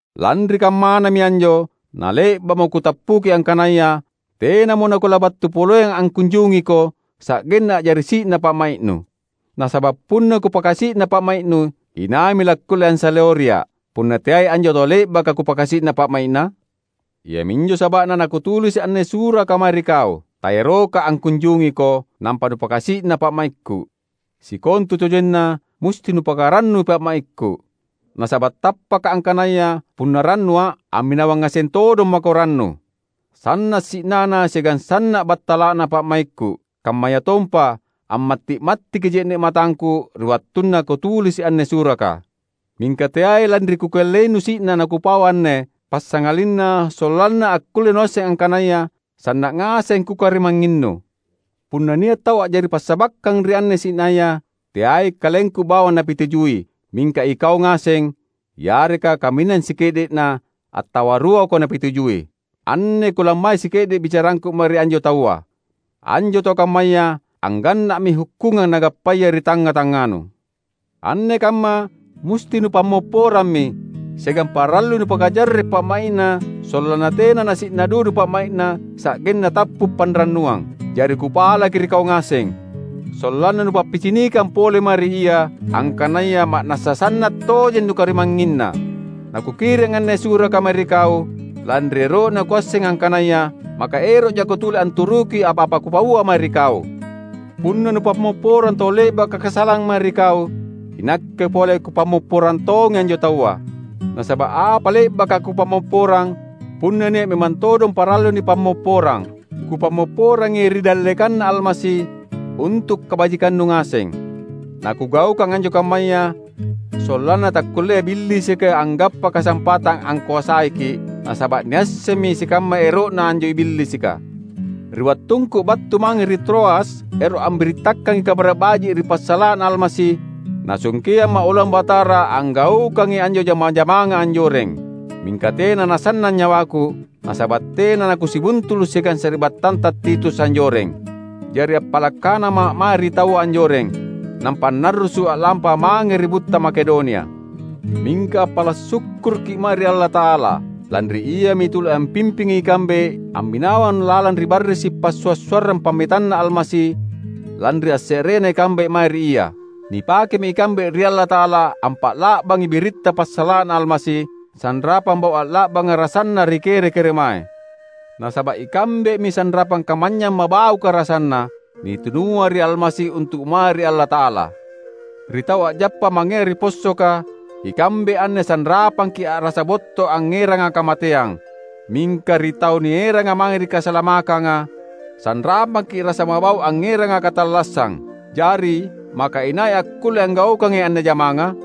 Lanri kammanami anjo nale’ba’mo kutappuki angkanaya tenamo nakulabattu poleang angkunjungiko sa’genna a’jari si’na pa’mai’nu. Nasaba’ punna kupakasi’na pa’mai’nu, inaimi lakkulle ansaleoria’, punna teai anjo tau le’baka kupakasi’na pa’mai’na? Iaminjo saba’na nakutulisi’ anne suraka mae ri kau. Taeroka’ angkunjungiko, nampa nupakasi’na pa’maikku. Sikontutojenna musti nupakarannui pa’maikku. Nasaba’ tappaka’ angkanaya punna rannua’, amminawang ngaseng todong mako rannu. Sanna’ si’nana siagang sanna’ battala’na pa’maikku, kammayatompa ammatti’-mattiki je’ne’ matangku ri wattunna kutulisi’ anne suraka. Mingka teai lanri kukellainu si’na nakupau anne, passangalinna sollanna akkulle nuasseng angkanaya sanna’ ngaseng kukarimangnginnu. Punna nia’ tau a’jari passabakkang ri anne si’naya, teai kalengku bawang napitujui, mingka ikau ngaseng, yareka kaminang sike’de’na attawa ruako napitujui. Anne kulammai sike’de’ bicarangku mae ri anjo taua. Anjo tau kammaya angganna’mi hukkungang nagappaya ri tangnga-tangnganu. Anne kamma musti nupammopporammi, siagang parallui nupakajarre’ pa’mai’na sollanna tena nasi’na dudu pa’mai’na sa’genna tappu’ panrannuang. Jari kupalaki ri kau ngaseng, sollanna nupappicinikang pole mae ri ia, angkanaya ma’nassa sanna’ tojeng nukarimangnginna. Nakukiring anne suraka mae ri kau, lanri ero’na kuasseng angkanaya maka ero’ jako tuli anturuki apa-apa kupaua mae ri kau. Punna nupammopporang tau le’baka kasalang mae ri kau, inakke pole kupammopporang tongi anjo taua. Nasaba’ apa le’baka kupammopporang — punna nia’ memang todong parallu nipammopporang — kupammopporangi ri dallekanNa Almasi, untu’ kabajikannu ngaseng. Nakugaukang anjo kammaya, sollanna takkullea Billisika anggappa kasampatang angkoasaiki’; nasaba’ niassemmi sikamma ero’na anjo Billisika. Ri wattungku battu mange ri Troas ero’ ambirittakangi Kabara’ Baji’ ri passala’na Almasi, Nasungkeamma’ oloang Batara anggaukangi anjo jama-jamanga anjoreng. Mingka tena nasannang nyawaku, nasaba’ tena nakusibuntulu’ siagang sari’battanta Titus anjoreng. Jari appala’ kanama’ mae ri taua anjoreng, nampa annarrusu’ a’lampa mange ri butta Makedonia. Mingka appala’ sukkurukki’ mae ri Allata’ala! Lanri Iami tuli ampimpingi ikambe amminawang lalang ri barrisi’ passua’-suarrang pammetanNa Almasi lanri asse’rena ikambe mae ri Ia. Nipakemi ikambe ri Allata’ala ampa’la’bangi biritta ri passala’na Almasi, sanrapang bau’ a’la’banga rasanna ri kere-keremae. Nasaba’ ikambemi sanrapang kamanynyang mabauka rasanna, nitunua ri Almasi untu’ mae ri Allata’ala. Ri tau a’jappa mangea ri possoka, ikambe anne sanrapangki’ a’rasa botto’ angngeranga kamateang; mingka ri tau nieranga mange ri kasalamakkanga, sanrapangki’ rasa mabau’ angngeranga katallassang. Jari, maka inai akkulle anggaukangi anne jamanga?